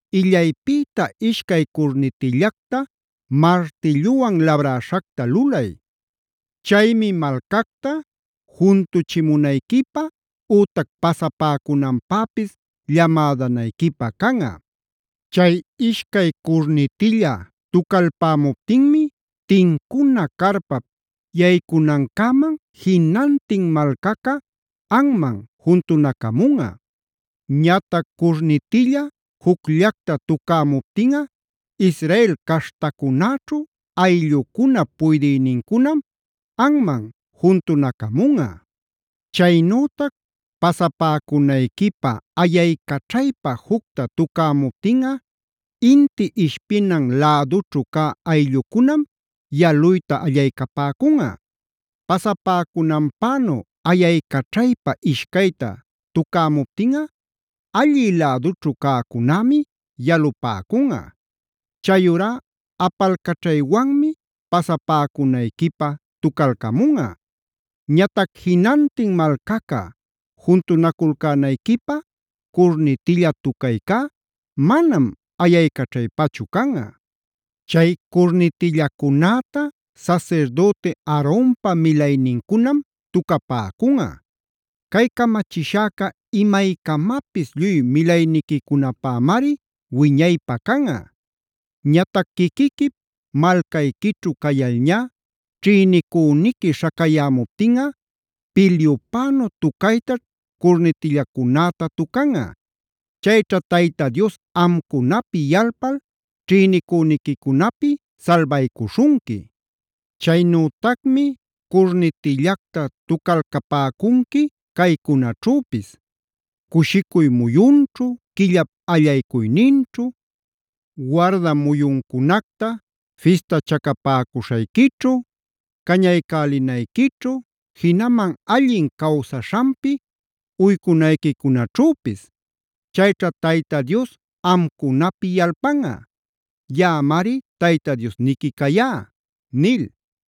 “Illaypïta ishcay curnitillacta martilluwan labräśhacta lulay. Chaymi malcacta juntuchimunayquipä ütac pasapäcunanpäpis llamädanayquipä canꞌa. Chay ishcay curnitilla tucalpämuptinmi tincuna carpap yaycuycunancäman jinantin malcaca anman juntunacamunꞌa. Ñatac curnitilla jucllacta tucämuptinꞌa Israel caśhtacunäćhu ayllucunap puydïnincunam anman juntunacamunꞌa. Chaynütac pasapäcunayquipä ayaycaćhaypa jucta tucämuptinꞌa inti ishpinan lädućhu cä ayllucunam yaluyta allaycapäcunꞌa. Pasapäcunanpänu ayaycaćhaypa ishcayta tucämuptinꞌa allï lädućhu cäcunämi yalupäcunꞌa. Chayurá apalcaćhaywanmi pasapäcunayquipä tucalcamunꞌa. Ñatac jinantin malcaca juntunaculcänayquipä curnitilla tucaycá manam ayaycaćhaypachu canꞌa. “Chay curnitillacunäta sasirdüti Aaronpa milaynincunam tucapäcunꞌa. Cay camachishäca imaycamapis lluy milayniquicunapämari wiñaypä canꞌa. “Ñatac quiquiquip malcayquićhu cayalñá ćhïnicüniqui śhacayämuptinꞌa, pilyupänu tucaytaćh curnitillacunäta tucanꞌa. Chayćha Tayta Dios amcunapi yalpal ćhïnicüniquicunapi salbaycuśhunqui. Chaynütacmi curnitillacta tucalcapäcunqui caycunaćhüpis: cushicuy muyunćhu, quillap allaycuyninćhu, warda muyuncunacta fistachacapäcuśhayquićhu, cañaycälinayquićhu, jinaman allin cawsaśhanpi uycunayquicunaćhüpis. Chayćha Tayta Dios amcunapi yalpanꞌa. Yaꞌamari Tayta Diosniqui cayá” nil.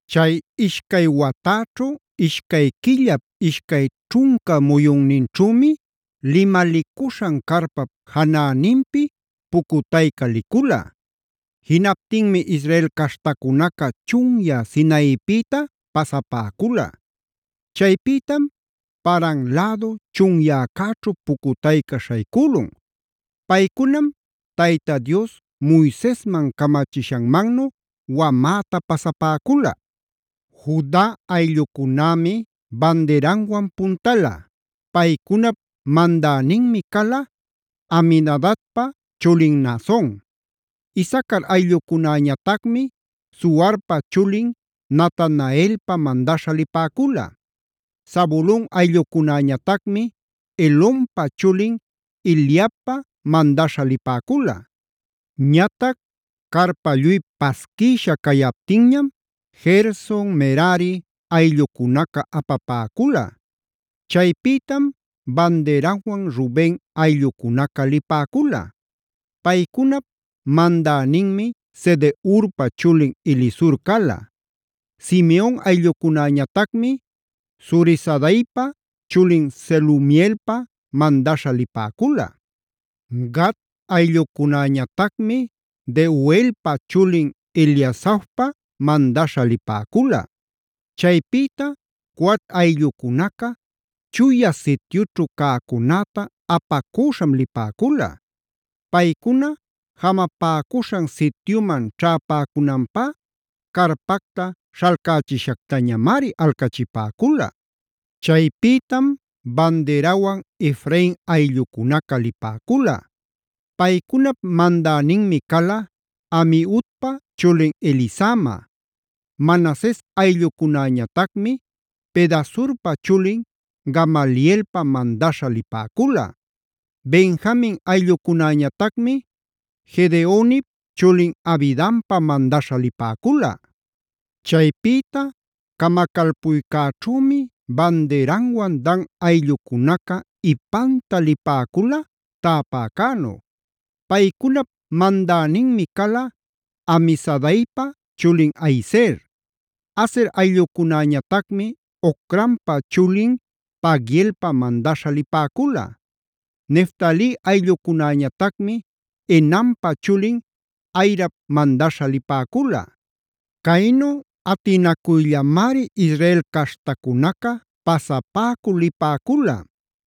Chay ishcay watäćhu, ishcay quillap ishcay ćhunca muyunninćhümi limalicuśhan carpap janäninpi pucutayca licula. Jinaptinmi Israel caśhtacunaca chunyä Sinaipïta pasapäcula. Chaypïtam Paran lädu chunyäcäćhu pucutayca śhaycülun. Paycunam Tayta Dios Moisesman camachishanmannu wamäta pasapäcula.a Juda ayllucunämi bandiranwan puntala. Paycunap mandäninmi cala Aminadabpa chulin Naason. Isacar ayllucunäñatacmi Zuarpa chulin Natanaelpa mandaśha lipäcula. Zabulon ayllucunäñatacmi Helonpa chulin Eliabpa mandaśha lipäcula. Ñatac carpa lluy pasquïsha cayaptinñam Gerson, Merari ayllucunaca apapäcula. Chaypïtam bandiranwan Ruben ayllucunaca lipäcula. Paycunap mandäninmi Sedeurpa chulin Elisur cala. Simeon ayllucunäñatacmi Zurisadaipa chulin Selumielpa mandaśha lipäcula. Gad ayllucunäñatacmi Deuelpa chulin Eliasafpa mandaśha lipäcula. Chaypïta Coat ayllucunaca Chuya Sityućhu cäcunäta apacüśham lipäcula. Paycuna jamapäcuśhan sityuman ćhäpäcunanpá carpacta śhalcächishactañamari alcachipäcula. Chaypïtam bandirawan Efrain ayllucunaca lipäcula. Paycunap mandäninmi cala Amiudpa chulin Elisama. Manases ayllucunäñatacmi Pedasurpa chulin Gamalielpa mandaśha lipäcula. Benjamin ayllucunäñatacmi Gedeonip chulin Abidanpa mandaśha lipäcula. Chaypïta camacalpuycäćhümi bandiranwan Dan ayllucunaca ipanta lipäcula täpäcänu. Paycunap mandäninmi cala Amisadaipa chulin Ahiezer. Aser ayllucunäñatacmi Ocranpa chulin Pagielpa mandaśha lipäcula. Neftali ayllucunäñatacmi Enanpä chulin Ahirap mandaśha lipäcula. Caynu atinacuyllamari Israel caśhtacunaca pasapäcul lipäcula.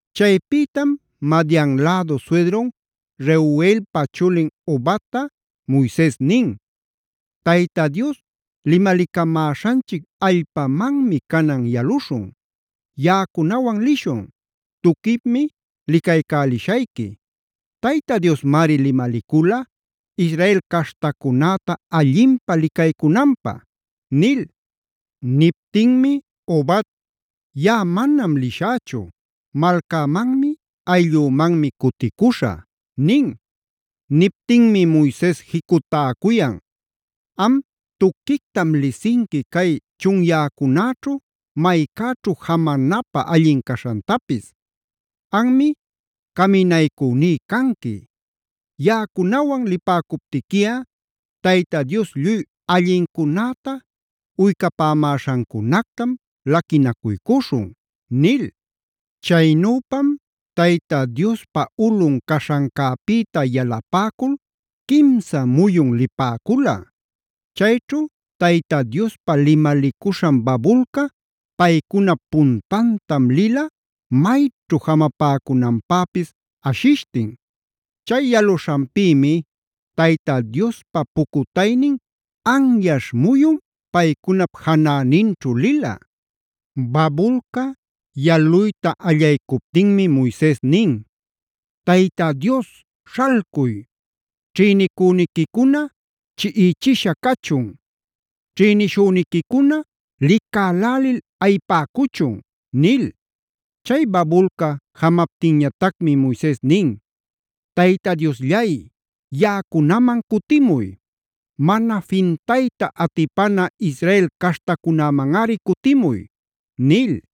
Chaypïtam Madian lädu suydrun Reguelpa chulin Hobat-ta Moises nin: “Tayta Dios limalicamäśhanchic allpamanmi canan yaluśhun. Yaꞌacunawan lishun; tuquipmi licaycälishayqui. Tayta Diosmari limalicula Israel caśhtacunäta allinpä licaycunanpä” nil. Niptinmi Hobad: “Yaꞌa manam lishächu. Malcämanmi, ayllümanmi cuticuśhä” nin. Niptinmi Moises jicutäcuyan: “Am tuquictam lisinqui cay chunyäcunäćhu maycäćhu jamanapä allin caśhantapis. Anmi caminaycüní canqui. Yaꞌacunawan lipäcuptiquiꞌa Tayta Dios lluy allincunäta uycapämäśhancunactam laquinacuycuśhun” nil. Chaynüpam Tayta Diospa ulꞌun caśhancäpïta yalapäcul quimsa muyun lipäcula. Chayćhu Tayta Diospa limalicuśhan babulca paycunap puntantam lila, mayćhu jamapäcunanpäpis ashishtin. Chay yaluśhanpïmi Tayta Diospa pucutaynin anyaśh muyun paycunap janäninćhu lila. Babulca yaluyta allaycuptinmi Moises nin: “¡Tayta Dios, śhalcuy! ¡Ćhïnicüniquicuna chiꞌichisha cachun! ¡Ćhïnishüniquicuna licälälil ayipäcuchun!”b nil. Chay babulca jamaptinñatacmi Moises nin: “¡Tayta Diosllay yaꞌacunaman cutimuy! ¡Mana fintayta atipana Israel caśhtacunämanꞌari cutimuy!” nil.